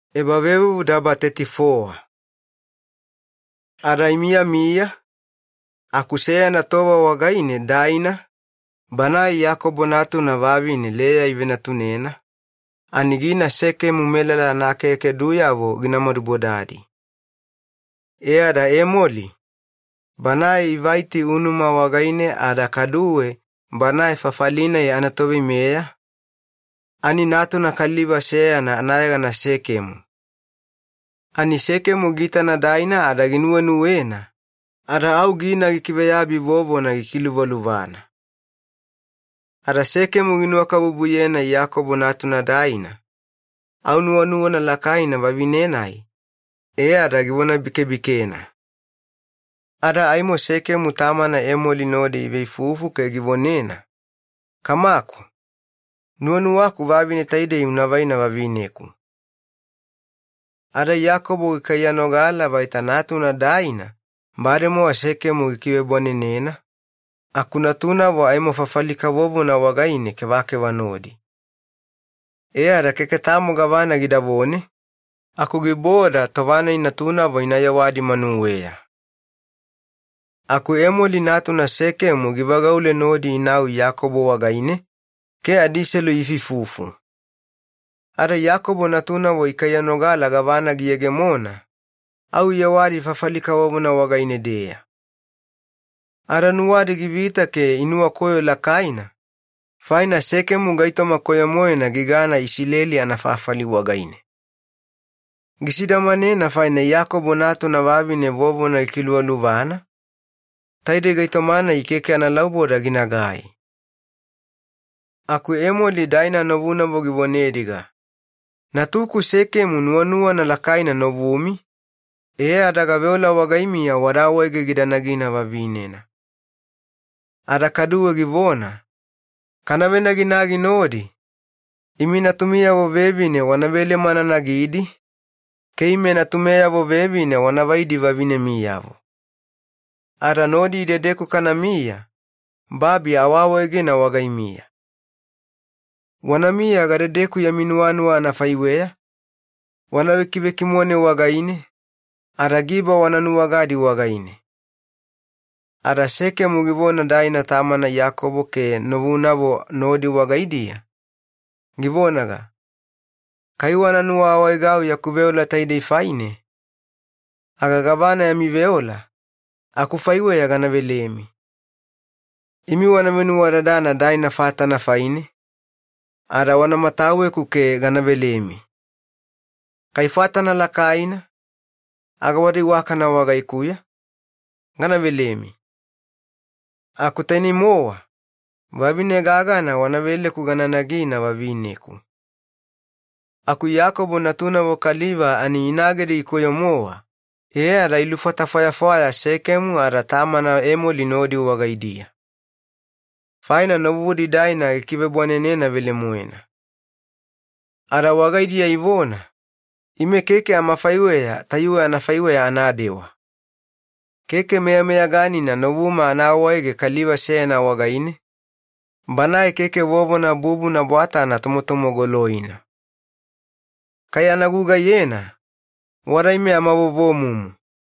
Daina ada meSekemu kaliva. Ada imiyamiya aku seyana tova wagaine Daina, banae Iyakobo natuna vavine Leya ivenatunena, ani gina Sekemu melala anaakeakeduyavo gina madubodadi. E ada Emoli, banae Ivaiti unuma wagaine ada kaduwe banae fafali-nai anatoveimeya ani natuna kaliva seyana anayegana Sekemu. Ani Sekemu giitana Daina ada ginuwenuwena ada au gina gikiveyabi vovona gikiluvaluvana. Ada Sekemu ginuwakabubuyena Daina Iyakobo natuna, au nuwanuwana lakaina vavine-nai, e ada givonabikebikena. Ada Sekemu tamana Emoli givonena, “Kamaku, nuwanuwaku vavine taidei unavaina vavineku.” Ada Iyakobo gikaiyanogala vaita natuna Daina bademowa Sekemu gikivebwanenena, aku natunavo aimo fafali kavovona wagaine kevakeva nodi. E ada keke tamo gavana gidavone aku giboda tova-nai natunavo iyewadi manuweya. Aku Emoli natuna Sekemu givagaule nodi inau Iyakobo wagaine ke adiselu iifuifufu. Ada Iyakobo natunavo ikaiyanogala gavana giyegemona, au iyewadi fafali kavovona wagaine-deya. Ada nuwadi givita ke inuwakoyo lakaina, faina Sekemu gaitoma koyo-moena gigana Isileli yana gabu wagaine. Gisidamanena faina Iyakobo natuna vavine vovona gikiluvaluvana, taidei gaitoma-nai keke analauboda ginagai. Aku Emoli Daina novunavo givonediga, “Natuku Sekemu nuwanuwana lakaina novumi, e ada gaveola wagaimiya wada awaege gida nagina vavinena.” Ada kaduwe givona, “Kana venaginagi nodi, imi natumiyavo vevine wana velema ana nagidi ke ime natumeyavo vevine wanavaidi vavinemiyavo. Ada meyameyaganina nodi idedeku kanamiya, babi aawawaegena wagaimiya. Wanamiya gadedeku yami nuwanuwa anafaiweya, wana vekivekimone wagaine, ada giba wana nuwagadi wagaine.” Ada Sekemu givona Daina tamana Iyakobo ke novunavo nodi wagaidiya, givonaga, “Kai wana nuwaawaegau yaku veola taidei faine aga gavana yami veola, akufaiweya gana velemi. Imi wana venuwadadana Daina fatana faine ada wana mataweku ke gana velemi. Kai fatana lakaina aga wada iwakana wagaikuya, aimo gana velemi. Aku tainei-mowa vavine gagana wana veleku gana nagina vavineku.” Aku Iyakobo natunavo kaliva ani inagedi gikoyo-mowa, e ada ilufata fwayafwaya Sekemu ada tamana Emoli nodi wagaidiya. Faina novudi Daina gikivebwanenena velemoena. Ada wagaidiya ivona, “Ime keke amafaiweya tayuwe anafaiweya anadewa. Keke meyameyaganina novuma ana awaege kaliva seyana wagaine banae keke vovona bubuna bwatana tomotomogoloina. Kai ana gugaiyena, wada ime amavovomumu.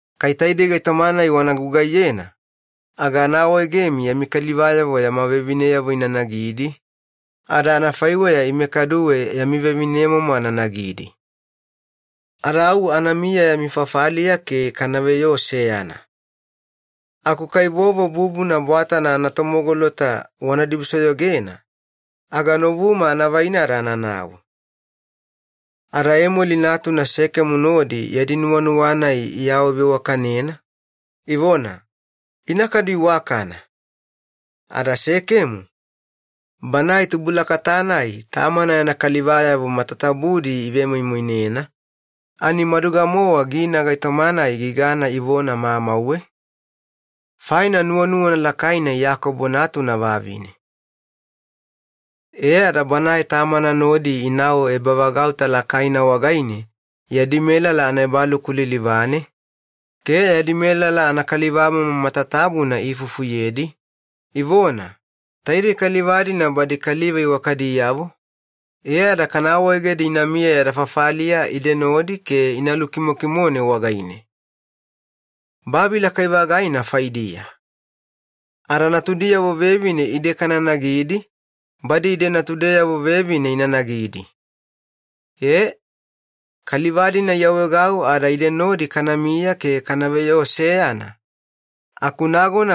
Kai taidei gaitoma-nai wana gugaiyena aga ya kalivayavo meyameyaganina yama vevineyavo ina nagidi, ada anafaiweya ime kaduwe yami vevinemomo ana nagidi. Ada au anamiya yami fafaliya ke kanaveyoo seyana. Aku kai vovo bubuna bwatana anatomogolota wana dibusoyogena, aga novuma anavaina ada ananau.” Ada Emoli natuna Sekemu nodi yadi nuwanuwa-nai iawaveiwakanena ivona, “Ina kadu iwakana.” Ada Sekemu, banae tubulakata-nai tamana yana kalivayavo matatabudi ivemoimoinena, ani maduga-mowa gina gaitoma-nai gigana ivona mamauwe, faina nuwanuwana lakaina Iyakobo natuna vavine. E ada banae tamana nodi inau ebavagauta lakaina wagaine yadi melala anaebaluku lilivane, ke yadi melala anakalivamomo matatabuna iifufuyedi, ivona, “Taidei kaliva-dina badi kaliva iwakadiyavo, e ada kana awaegedi ina miya yada fafaliya ide nodi ke ina lukimokimone wagaine. Babi lakai-vagaina faidiya. Ada natudiyavo vevine ide kana nagidi, badi ide natudeyavo vevine ina nagidi. Aku kaliva-dina iawaegau ada ide nodi kanamiya ke kanaveyoo seyana,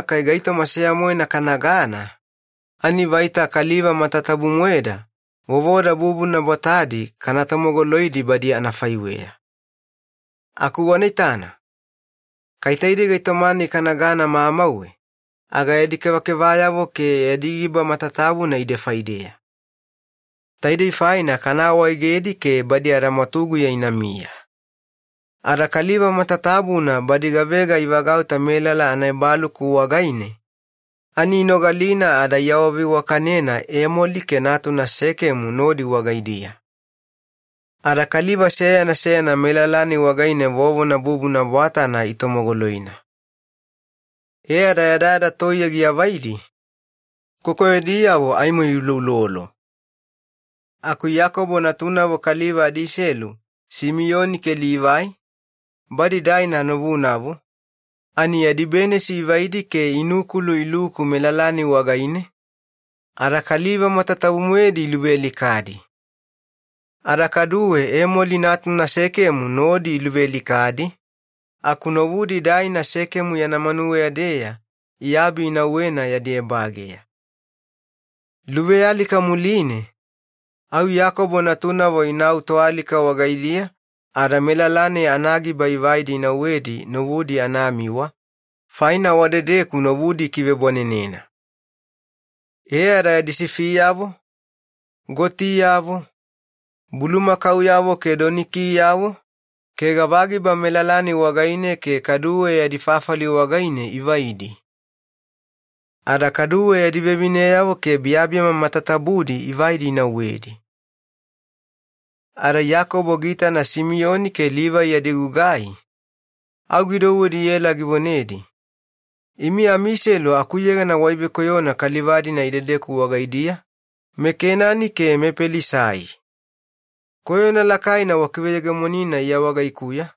kai gaitoma seya-moena kanagana, ani vaita kaliva matatabu-moeda vovoda bubuna bwatadi kana tomogoloidi badi anafaiweya. Aku wanaitana, kai taidei gaitoma-nai kanagana mamauwe aga yadi kevakevayavo ke yadi giba matatabuna ide faideya. Taidei faine kana awaegedi ke badi adamwatuguya inamiya.” Ada kaliva matatabuna badi gavega ivagauta melala anaebaluku wagaine ani inogalina ada iawaveiwakana Emoli ke natuna Sekemu nodi wagaidiya. Ada kaliva seyana seyana melala-nai wagaine vovona bubuna bwatana itomogoloina. E ada yadayada toiye giavaidi muline kokoyodiyavo aimo iuloulolo, aku Iyakobo natunavo kaliva adiselu Simiyoni ke Livai, badi Daina novunavo, ani yadi benisi ivaidi ada inukulu iluku melala-nai wagaine ke kaliva matatabu-moedi iluvealikadi. Ada kaduwe Emoli natuna Sekemu nodi iluvealikadi aku novudi Daina Sekemu yana manuweya-deya iabi inauwena yadi ebageya. Luvealika muline au Iyakobo natunavo inau toalika wagaidiya ada melala-nai anagiba ivaidi inauwedi novudi anamiwa, faina wadedeku novudi ikivebwanenena. E ada yadi sifiyavo, gotiyavo, bulumakauyavo ke donikiyavo ke gava giba melala-nai wagaine ke kaduwe yadi fafali wagaidiya ivaidi. Ada kaduwe yadi vevineyavo ke biyabiyama matatabu-moedi ivaidi inauwedi. Ada Iyakobo giitana Simiyoni ke Livai yadi gugai, au gidouwedi iela givonedi, “Imi amiselu akuyegana waivekoyona kaliva-dina idedeku wagaidiya, meKenani ke mePelisai. Koyona lakaina wakiveyegemonina iya wagaikuya,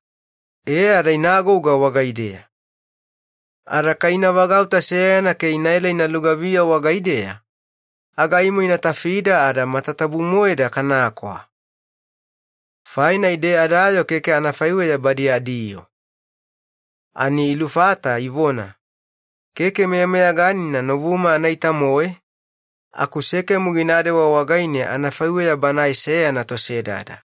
e ada ina agouga wagaideya. Ada kai ina vagauta seyana ke inaela ina lugaviya wagaideya aga aimo ina tafida ada matatabu-moeda kanakwa, faina ide adayoo keke anafaiweya badi adiyoo.” Ani ilufata, ivona, “Keke meyameyaganina novuma anaita-moe aku Sekemu ginadewa wagaine anafaiweya banae seyana tosedada.”